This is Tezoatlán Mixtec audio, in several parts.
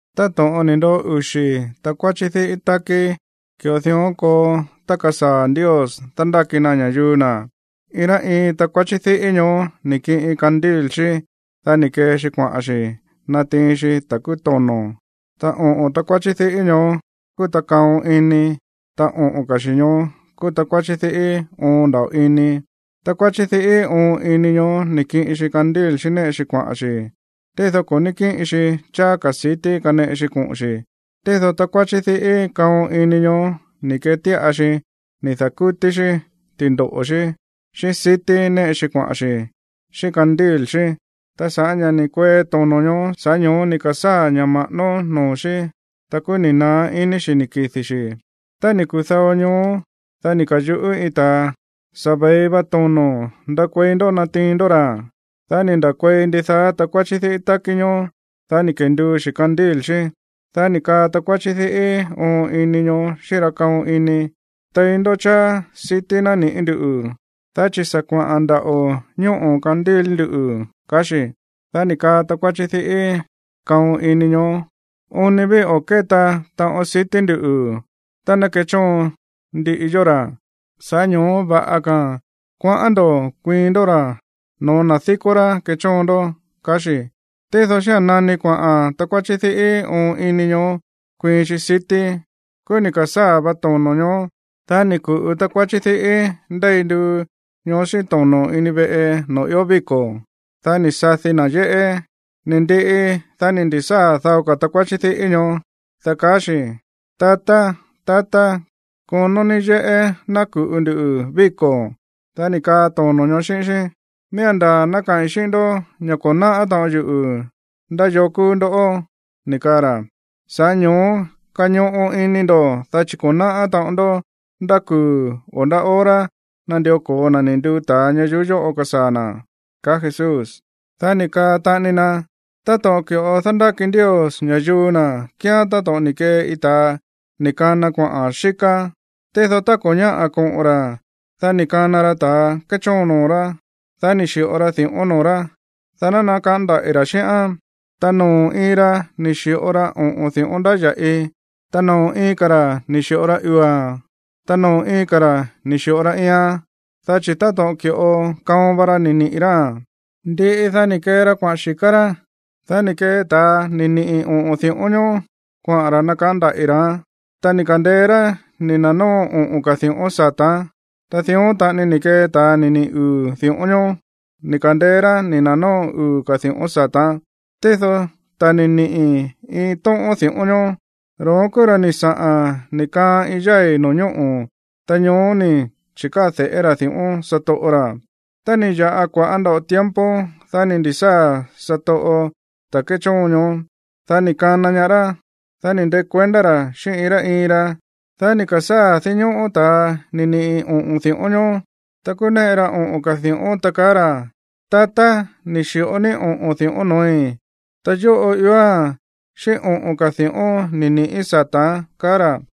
’Táto̱ꞌon ni̱ ndoꞌo uxi̱ takuáchí diꞌí tákí, ki̱ꞌo dión koo tá kasaa̱ Ndios dándáki na ña̱yuu na̱. Iin rá iin takuáchí diꞌí ñoó ni̱ kiꞌin candil xí, dá ni̱ kee xi kuaꞌa̱n xi̱ natiin xi ta̱ kúú tono̱. Ta oꞌo̱n takuáchí diꞌí ñoó kúú ta kaon ini, ta oꞌo̱n ka̱ xi̱ ñoó kúú takuáchí diꞌí oon nda̱ꞌo ini. Takuáchí diꞌí oon ini ñoó ni̱ kiꞌin xi candil xí néꞌe xi kuaꞌa̱n xi̱, tído ko̱ ní kíꞌin xi cháá ka̱ sití kaneꞌe xi koꞌo̱n xi̱. Tído takuáchí diꞌí kaon ini ñoó ni̱ ketíꞌa xi ni̱ da̱kútí xí ti̱ndoꞌo̱ xí xíꞌín sití néꞌe xi kuaꞌa̱n xi̱ xíꞌín candil xí. Ta sa̱ꞌá ña̱ ni̱ kuee tono̱ ñoó, sa̱ꞌá ño̱ó ni̱ ka̱sáa̱ ña̱ ma̱ꞌánó noo̱ xí, ta kúú ni̱ naá iní xi̱ ni̱ kidi̱ xi̱. Ta ni̱ kudao ñoó, dá ni̱ ka̱yuꞌú iin ta̱a: “Sa̱ ve̱i va tono̱. Ndakuei ndó natiin ndó ra̱.” Dá ni̱ nda̱kuei ndidaá takuáchí diꞌí tákí ñoó, dá ni̱ kenduu xi̱ candil xí. Dá ni̱ kaa takuáchí diꞌí oon ini ñoó xíꞌín ra kaon ini: “Tei ndó cháá sití naniꞌi̱ ndú, dá chi̱ sa̱ kuaꞌa̱n ndaꞌo̱ ñóꞌo̱ candil nduꞌu̱”, kaá xi̱. Dá ni̱ kaa takuáchí diꞌí kaon ini ñoó: “Oon ni ví o̱ kéta taꞌon sití ndu̱ tá ná kechóon ndiꞌi yó ra̱. Sa̱ꞌá ño̱ó va̱ꞌa ka̱a̱n kuaꞌán ndo̱ kuiin ndó ra̱ no̱ó na̱ díkó rá kechóon ndó”, kaá xi̱. Tído xía̱n nani kuaꞌa̱n takuáchí diꞌí oon ini ñoó kuiin xi sití, kúú ni̱ ka̱sáa̱ vá tono̱ ñoó. Dá ni̱ ku̱ꞌu takuáchí diꞌí ndéi nduu ñoó xíꞌín tono̱ ini veꞌe noo̱ ió víko̱. Dá ni̱ sadi na̱ yéꞌé. Ni̱ ndiꞌi, dá ni̱ ndi̱sáa̱ dao ka̱ takuáchí diꞌí ñoó, dá kaá xi̱: “Tatá, tatá, konó ní yéꞌé ná ku̱ꞌu ndu víko̱.” Dá ni̱ kaa tono̱ ñoó xíꞌín xí: “Miía̱n ndaa̱ ná kaꞌi̱n xíꞌín ndó ña̱ ko̱ náꞌá taꞌon yuꞌu̱ ndá yoo kúú ndoꞌó”, ni̱ kaa ra̱. Sa̱ꞌá ño̱ó kañoꞌo ini ndo̱, dá chi̱ ko̱ náꞌá taꞌon ndó ndá kuu̱ o ndá hora nandió ko̱o na̱ ni̱ nduu ta̱a ñayuú yóꞌo kasaa̱ na̱ ―kaa Jesús. Dá ni̱ kaa taꞌani na: ―Táto̱ꞌon ki̱ꞌo dándáki Ndios ña̱yuu na̱ kíán táto̱ꞌon ni̱ kee iin ta̱a ni̱ kana kuaꞌa̱n xíká. Tído tá ko̱ ñáꞌa̱ koꞌo̱n ra̱, dá ni̱ kana ra ta̱a kéchóon noo̱ rá. Dá ni̱ xi̱ꞌo ra di̱ꞌón noo̱ rá, dá ná nakaꞌán ndaꞌi̱ ra̱ xíꞌán. Ta noo̱ iin ra ni̱ xi̱ꞌo ra oꞌo̱n di̱ꞌón ndáya̱ꞌi, ta noo̱ iin ka̱ ra̱ ni̱ xi̱ꞌo ra uu̱a̱n, ta noo̱ iin ka̱ ra̱ ni̱ xi̱ꞌo ra iian. Dá chi̱ táto̱ꞌon ki̱ꞌo kaon va ra ni̱ niꞌi̱ ráa̱n. Ndiꞌi, dá ni̱ kee ra kuaꞌa̱n xi̱ká rá. Dá ni̱ kee ta̱a ni̱ niꞌi̱ oꞌo̱n di̱ꞌón ñoó kuaꞌa̱n ra̱ nakaꞌán ndaꞌi̱ ra̱án. Ta ni̱ ka̱ndeé rá ni̱ na̱nóo oꞌo̱n ka̱ di̱ꞌón sata̱án. Ta dión taꞌani ni̱ kee ta̱a ni̱ niꞌi̱ uu̱ di̱ꞌón ñoó. Ni̱ ka̱ndeé rá ni̱ na̱nóo uu̱ ka̱ di̱ꞌón sata̱án. Tído ta̱ ni̱ niꞌi̱ iin tóꞌón di̱ꞌón ñoó, ro̱ón kúú ra̱ ni̱ saꞌa̱n ni̱ kaan iin yái̱ no̱ñóꞌo̱, ta ñoó ni̱ chi̱káa̱ de̱ꞌé ra̱ di̱ꞌón satoꞌo ra̱. ’Tá ni̱ ya̱ꞌa kua̱ꞌá nda̱ꞌo tiempo, dá ni̱ ndi̱sáa̱ satoꞌo ta̱ kéchóon ñoó. Dá ni̱ kana ñaá rá, dá ni̱ ndekuendá ra̱ xíꞌín iin rá iin ra. Dá ni̱ ka̱sáa̱ dinñóꞌó ta̱a ni̱ niꞌi̱ oꞌo̱n di̱ꞌón ñoó. Ta kúú néꞌe ra oꞌo̱n ka̱ di̱ꞌón, ta kaá ra̱: “Tatá, ni̱ xi̱ꞌo ní oꞌo̱n di̱ꞌón no̱ói̱. Ta yóꞌo ióa̱n xíꞌín oꞌo̱n ka̱ di̱ꞌón ni̱ ni̱ꞌí sata̱án”, kaá ra̱.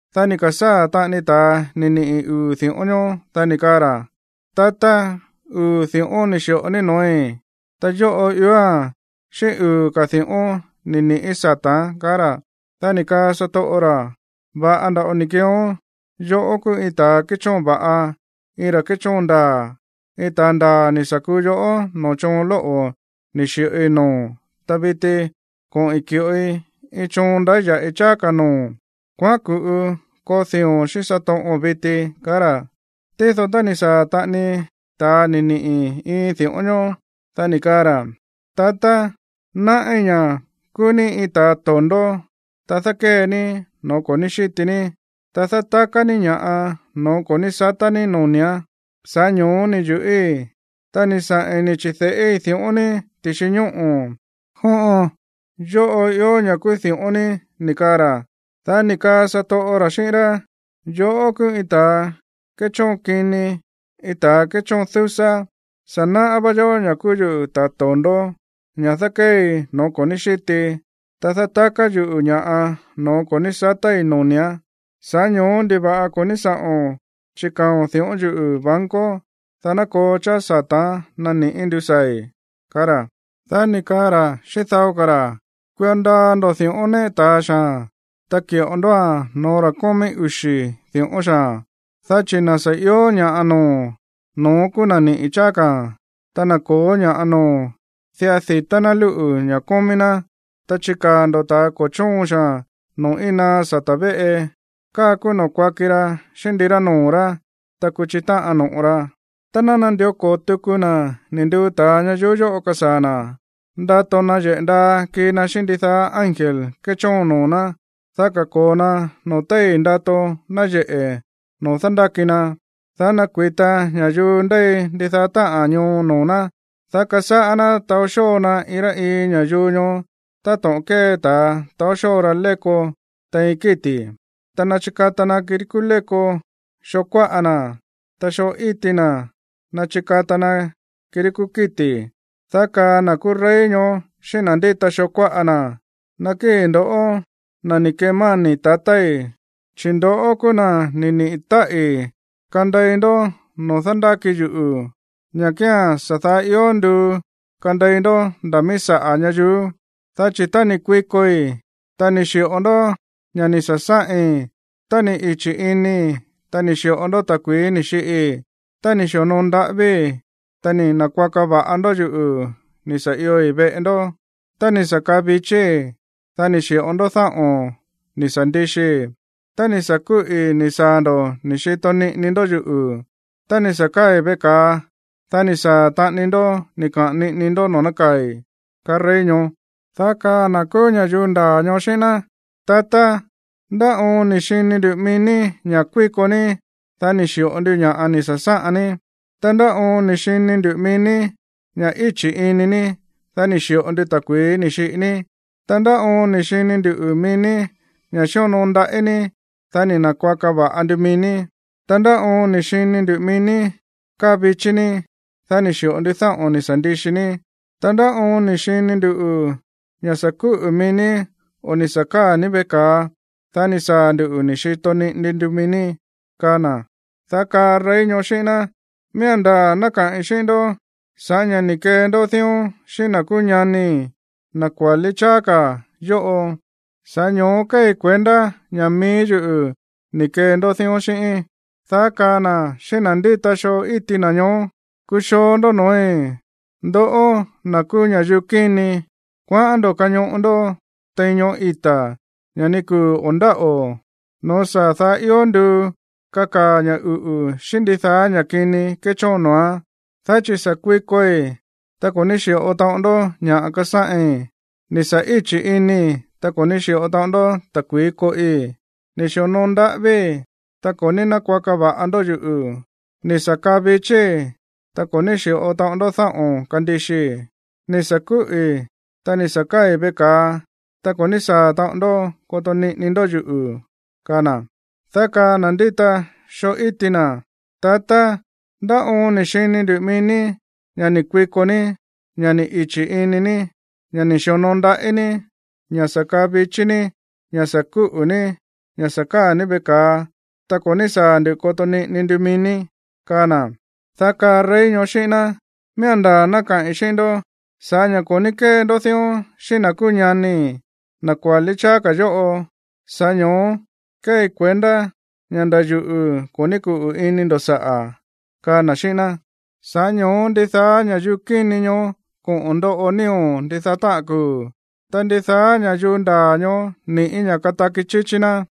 ’Dá ni̱ ka̱sáa̱ taꞌani ta̱a ni̱ niꞌi̱ uu̱ di̱ꞌón ñoó, dá ni̱ kaa ra̱: “Tatá, uu̱ di̱ꞌón ni̱ xi̱ꞌo ní no̱ói̱. Ta yóꞌo ióa̱n xíꞌín uu̱ ka̱ di̱ꞌón ni̱ ni̱ꞌí sata̱án”, kaá ra̱. Dá ni̱ kaa satoꞌo ra̱: “Va̱ꞌa nda̱ꞌo ni̱ keeón. Yoꞌó kúú iin ta̱ kéchóon va̱ꞌa, iin ra̱ kéchóon ndaa̱. Iin ta̱a ndaa̱ ni̱ sa̱ kuu yoꞌó noo̱ choon lóꞌo̱ ni̱ xi̱ꞌoi noo̱o̱n, ta viti koꞌi̱n ki̱ꞌoi iin choon ndáya̱ꞌi cháá ka̱ noo̱o̱n. Kuaꞌán ku̱ꞌu koo dii̱o̱n xíꞌín satoꞌo̱n viti”, kaá ra̱. ’Tído tá ni̱ ka̱sáa̱ taꞌani ta̱a ni̱ niꞌi̱ iin di̱ꞌón ñoó, dá ni̱ kaa ra̱: “Tatá, náꞌí ña̱ kúú ní iin ta̱a to̱ndó, ta dákée ní no̱ó ko̱ ní xíti ní, ta dátaká ní ña̱ꞌa noo̱ ko̱ ní satá ní noni̱án. Sa̱ꞌá ño̱ó ni̱ yu̱ꞌíi̱, ta ni̱ saꞌi̱n ni̱ chi̱de̱ꞌíi̱ di̱ꞌón ní ti̱xi ñóꞌo̱. Jóꞌon, yóꞌo ió ña̱ kúú di̱ꞌón ní”, ni̱ kaa ra̱. Dá ni̱ kaa satoꞌo ra̱ xíꞌín rá: “Yoꞌó kúú iin ta̱ kéchóon kini, iin ta̱ kéchóon dúsá. Sa̱ náꞌá vá yoꞌó ña̱ kúú yuꞌu̱ ta̱ to̱ndó, ña̱ dákéei no̱ó ko̱ ní xítii, ta dátaká yuꞌu̱ ña̱ꞌa no̱ó ko̱ ní satái̱ noni̱án. Sa̱ꞌá ño̱ó, ¿ndiva̱ꞌa ko̱ ní sáꞌo̱n chikaa̱o̱n di̱ꞌón yuꞌu̱ banco, dá ná koo cháá sata̱án nani ndusaa̱i̱?”, kaá ra̱. ’Dá ni̱ kaa ra̱ xíꞌín dao ka̱ ra̱: “Kuio ndaa ndo̱ di̱ꞌón néꞌe ta̱a xaa̱n, ta ki̱ꞌo ndóa̱n no̱ó ra̱ kómí uxi̱ di̱ꞌón xaa̱n. Dá chi̱ na̱ sa̱ ió ña̱ꞌa noo̱, no̱ón kúú na̱ niꞌi̱ cháá ka̱a̱n. Ta na̱ ko̱ó ña̱ꞌa noo̱, diꞌa di̱tá ná lúꞌu̱ ña̱ kómí ná. Ta chikaa̱ ndo̱ ta̱ ko̱ chóon xaa̱n noo̱ íin naá sata̱ véꞌe. Káa kúú noo̱ kuaki ra xíꞌín ndirá noo̱ ra̱, ta kuchi táꞌan no̱ꞌo ra.” ’Tá ná nandió ko̱o tuku na̱ ni̱ nduu ta̱a ñayuú yóꞌo kasaa̱ na̱, ndato nayeꞌe̱ ndaa kii na xíꞌín ndidaá ángel kéchóon noo̱ ná, dá kako̱o na noo̱ téi̱ ndato nayeꞌe̱ noo̱ dándáki na, dá nakui̱ta ña̱yuu ndéi ndidaá táꞌa̱n ñoo noo̱ ná, dá kasáꞌá ná taó xóo na iin rá iin ña̱yuu ñoó táto̱ꞌon kée ta̱a taó xóo ra léko tein kíti̱. Ta ná chikata na kirí kúú léko xoo kuáꞌa na̱, ta xoo íti na̱ ná chikata na kirí kúú kíti̱. Dá kaa na̱ kúú rey ñoó xíꞌín na̱ ndíta xoo kuáꞌa na̱: “Nakíi̱ ndo̱ꞌó, na̱ ni̱ kemáni̱ tatái̱, chi̱ ndoꞌó kúú na̱ ni̱ niꞌi̱ táꞌi̱ kandei ndó noo̱ dándáki yuꞌu̱, ña̱ kía̱n sa̱ daá ió nduu kandei ndó nda̱ míí saꞌa̱ ñayuú. Dá chi̱ tá ni̱ kuikoi, ta ni̱ xi̱ꞌo ndó ña̱ꞌa ni̱ sa̱sáꞌin; tá ni̱ ichi̱ inii̱, ta ni̱ xi̱ꞌo ndó ta̱kui̱í ni̱ xiꞌii; tá ni̱ xi̱onoo ndaꞌávíi̱, ta ni̱ na̱kuaka va̱ꞌa ndó yuꞌu̱ ni̱ sa̱ ioi̱ veꞌe ndó; tá ni̱ sa̱ kaa vichíí, dá ni̱ xi̱ꞌo ndó dáꞌo̱n ni̱ sa̱ ndixii; tá ni̱ sa̱ kúꞌi̱ ni̱ saa̱ ndo̱ ni̱ xito niꞌini ndó yuꞌu̱; tá ni̱ sa̱ káa̱i̱ veꞌe ka̱a, dá ni̱ saa̱ taꞌani ndó ni̱ kaꞌa̱n niꞌini ndó noo̱ nákaa̱i̱”, kaa rey ñoó. Dá kaa na̱ kúú ña̱yuu ndaa̱ ñoó xíꞌín ná: “Tatá, ¿ndá oon ni̱ xini ndu̱ mií ní ña̱ kuíko ní, dá ni̱ xi̱ꞌo ndu ña̱ꞌa ni̱ sa̱sáꞌan ní? Ta, ¿ndá oon ni̱ xini ndu̱ mií ní ña̱ íchi̱ ini ní, dá ni̱ xi̱ꞌo ndu ta̱kui̱í ni̱ xiꞌi ní? Ta, ¿ndá oon ni̱ xini ndu̱ mií ní ña̱ xíonoo ndaꞌí ní, dá ni̱ na̱kuaka va̱ꞌa ndu mií ní? Ta, ¿ndá oon ni̱ xini ndu̱ mií ní káa vichí ní, dá ni̱ xi̱ꞌo ndu dáꞌo̱n ni̱ sa̱ ndixi ní? Ta, ¿ndá oon ni̱ xini ndu̱ ña̱ sa̱ kúꞌu̱ mií ní o ni̱ sa̱ káa̱ ní veꞌe ka̱a, dá ni̱ saa̱ ndu̱ ni̱ xito niꞌini ndu mií ní?”, kaa na̱. Dá kaá rey ñoó xíꞌín ná: “Miía̱n ndaa̱ ná kaꞌi̱n xíꞌín ndó ña̱ sa̱ꞌá ña̱ ni̱ kee ndó dión xíꞌín na̱ kúú ñanii̱, na̱ kuálí cháá ka̱ yóꞌo, sa̱ꞌá ño̱ó kéei kuendá ña̱ mií yuꞌu̱ ni̱ kee ndó dión xíꞌíín.” ’Dá kaa na̱ xíꞌín na̱ ndíta xoo íti na̱ ñoó: “Kuxoo ndó no̱ói̱, ndoꞌó na̱ kúú ña̱yuu kíni. Kuaꞌán ndo̱ kañoꞌo ndó tein ñoꞌó ita̱, ña̱ ni kuu̱ o̱ ndáꞌo̱, no̱ó sa̱ daá ió nduu kakaa̱ ña̱ uꞌu̱ xíꞌín ndidaá ña̱ kini kéchóon noo̱án. Dá chi̱ sa̱ kuikoi, ta ko̱ ní xi̱ꞌo taꞌon ndó ña̱ꞌa kasáꞌin; ni̱ sa̱ íchi̱ inii̱, ta ko̱ ní xi̱ꞌo taꞌon ndó ta̱kui̱í koꞌi; ni̱ xi̱onoo ndaꞌávíi̱, ta ko̱ ní nákuaka va̱ꞌa ndó yuꞌu̱, ni̱ sa̱ kaa vichíí, ta ko̱ ní xi̱ꞌo taꞌon ndó dáꞌo̱n kandixii, ni̱ sa̱ kúꞌi̱, ta ni̱ sa̱ káa̱i̱ veꞌe ka̱a, ta ko̱ ní saa̱ taꞌon ndó koto niꞌini ndó yuꞌu̱”, kaa na̱. Dá kaa na̱ ndíta xoo íti na̱: “Tatá, ¿ndá oon ni̱ xini nduꞌu̱ mií ní ña̱ ni̱ kuiko ní, ña̱ ni̱ ichi̱ ini ní, ña̱ ni̱ xi̱onoo ndaꞌí ní, ña̱ sa̱ kaa vichí ní, ña̱ sa̱ kúꞌu̱ ní, ña̱ sa̱ káa̱ ní veꞌe ka̱a, ta ko̱ ní saa̱ ndu̱ koto niꞌini ndu mií ní?”, kaa na̱. Dá kaa rey ñoó xíꞌín ná: “Miía̱n ndaa̱ ná kaꞌi̱n xíꞌín ndó ña̱ sa̱ꞌá ña̱ ko̱ ní kée ndó dión xíꞌín na̱ kúú ñanii̱, na̱ kuálí cháá ka̱ yóꞌo, sa̱ꞌá ño̱ó kéei kuendá ña̱ nda̱ yuꞌu̱ ko̱ ní kuꞌu̱ ini ndo̱ saꞌa̱”, kaa na̱ xíꞌín ná. Sa̱ꞌá ño̱ó ndidaá ña̱yuu kíni ñoó koꞌo̱n ndoꞌo nío̱ ndidaá táꞌa̱n kuu̱, ta ndidaá ña̱yuu ndaa̱ ñoó ni̱ꞌí ña̱ kataki chíchí ná.